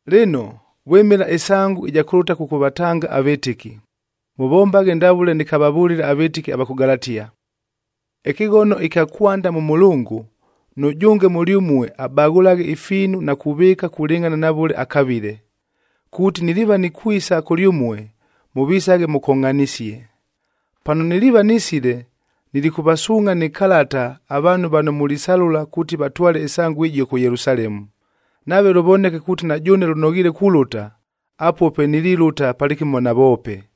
Lɨno, vwɨmɨla ɨsangu ɨja kʉlʉta kʉkʉvatanga avɨtɨki, mʉvombaghe ndavʉle nɨkavavʉlile avɨtɨki ava kʉ Galatia. Ɨkɨghono ɨkya kwanda mʉ mʉlʉngʉ,a nʉjʉnge mʉlyʉmue abaghʉlaghe ifiinu na kuvɨɨka kulɨngʼhana na vʉle akavile, kuuti niliiva nikwisa kʉlyʉmue, mʉvisaghe mʉkongʼhanisie. Pano niliiva nisile, nilikʉvasuungʼha nɨ kalata avaanhu vano mulisalʉla kuuti vatwale ɨsangu ɨjio kʉ Yelusalemu. Nave lʉvoneke kuuti na jʉʉne lʉnoghiile kulʉta, apuo pe nililʉta palɨkɨmo navoope.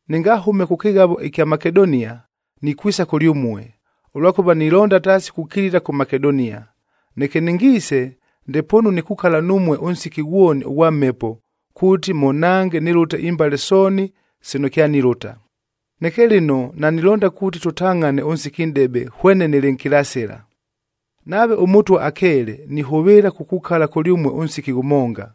Nɨngahʉme kʉ kɨghavob ɨkya Makedonia, nikwisa kʉlyʉmue, ʉlwakʉva nilonda taasi kukilila kʉ Makedonia. Neke nɨngiise, ndepoonu nikukala numue ʉnsiki ghwoni ʉghwa mhepo kuuti mʉnhange nɨlʉte imbale sooni sino kyanilʉta. Neke lɨno nanilonda kuuti tʉtangʼhane ʉnsiki nʼdebe hwene nɨlɨ nkilasɨla. Nave ʉMʉtwa akeele, nihʉvɨɨla kukukala kʉlyʉmue ʉnsiki ghʉmonga.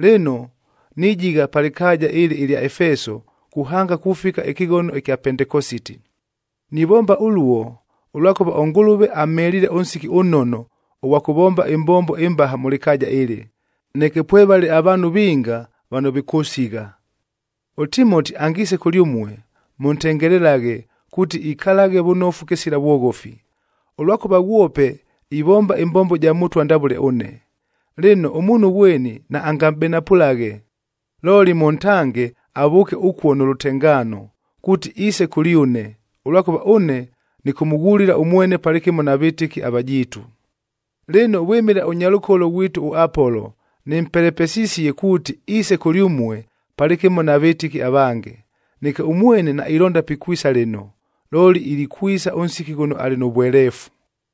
Lɨno, nijigha pa lɨkaaja ɨlɨ ɨlya Efeso kuhanga kufika ɨkɨghono ɨkya Pentekositi. Nivomba ʉluo, ʉlwakʉva ʉNgʉlʉve amheliile ʉnsiki ʉnnono ʉghwa kʉvomba ɨmbombo ɨmbaha mʉ lɨkaaja ɨlɨ, neke pwevale avaanhu vinga vano vikʉsigha. ɄTimoti angiise kʉlyʉmue, mʉntengelelaghe kuuti ikalaghe vʉnofu kɨsila vwoghofi, ʉlwakʉva ghwope ivomba ɨmbombo ja Mʉtwa ndavʉle ʉne. Lɨno, ʉmuunhu ghweni naangamʼbenapʉlaghe. Looli mʉntange avʉʉke ʉkuo nʉ lʉtengaano, kuuti iise kʉlyʉne, ʉlwakʉva ʉne nɨkʉmʉghulila ʉmwene palɨkɨmo na vɨtɨki avajiitu. Lɨno, vwɨmɨla ʉnyalʉkolo ghwitu ʉApolo, nɨmpelepesisie kuuti iise kʉlyʉmue palɨkɨmo na vɨtɨki avange. Neke ʉmwene nailonda pikwisa lɨno, looli ilikwisa ʉnsiki ghʉno alɨ nʉ vweleefu.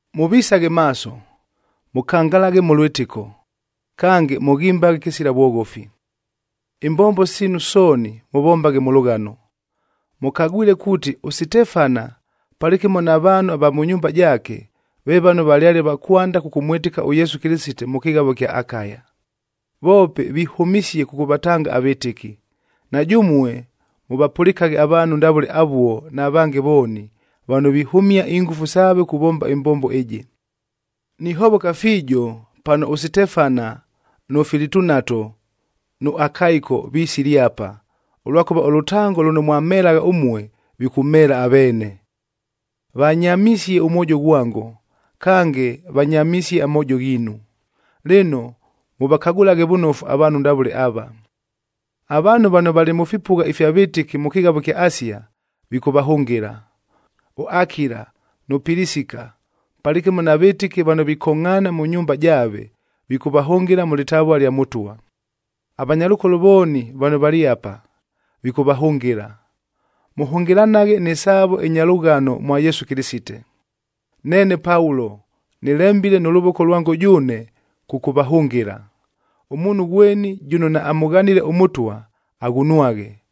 Mʉvisaghe maaso, mʉkangalaghe mʉ lwɨtɨko, kange mʉghimbaghe kɨsila vwoghofi. Imbombo siinu sooni mʉvombaghe mʉ lʉghano. Mʉkagwile kuuti, ʉSitefana palɨkɨmo na vaanhu va mʉ nyumba jaake, ve vano valyale va kwanda kʉkʉmwɨtɨka ʉYesu Kɨlɨsite mʉ kɨghavo ɨkya Akaya, voope vihʉmisie kʉkʉvatanga avɨtɨki! Na jʉmue mʉvapʉlɨkaghe avaanhu ndavʉle avuo na vange vooni, vano vihʉmia ingʉfu saave kuvomba ɨmbombo ɨjɨ. Nihovoka fiijo pano ʉSitefana, nʉ Filitunato, nʉ Akaiko, visile apa, ʉlwakʉva ʉlʉtango lʉno mwamhelagha ʉmue, vikʉmheela aveene. Vanyamisie ʉmwojo ghwango, kange vanyamisie amoojo ghiinu. Lɨno, mʉvakagʉlaghe vʉnofu avaanhu ndavʉle ava. Avaanhu vano valɨ mʉ fipʉgha ifya vɨtɨki mʉ kɨghavo ɨkya Asia, vikʉvahʉngɨla. ɄAkila nʉ Pilisika, palɨkɨmo na vɨtɨki vano vikongʼhaana mʉ nyumba jaave, vikʉvahʉngɨla mʉ lɨtavua lya Mʉtwa. Avanyalʉkolo vooni vano valɨ apa, vikʉvahʉngɨla. Mʉhʉngɨlanaghe nɨ saavo ɨnya lʉghano mwa Yesu Kɨlɨsite. Neene Paulo, nɨlembile nʉ lʉvoko lwango jʉʉne, kʉkʉvahʉngɨla. Ʉmuunhu ghweni jʉno naamʉghanile ʉMʉtwa, aghunwaghe.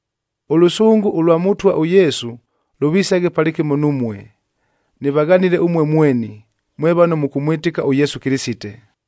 Ʉlʉsʉngʉ ʉlwa Mʉtwa ʉYesu lʉvisaghe palɨkɨmo numue. Nɨvaghanile ʉmue mweni, mwe vano mʉkʉmwɨtɨka ʉYesu Kɨlɨsite.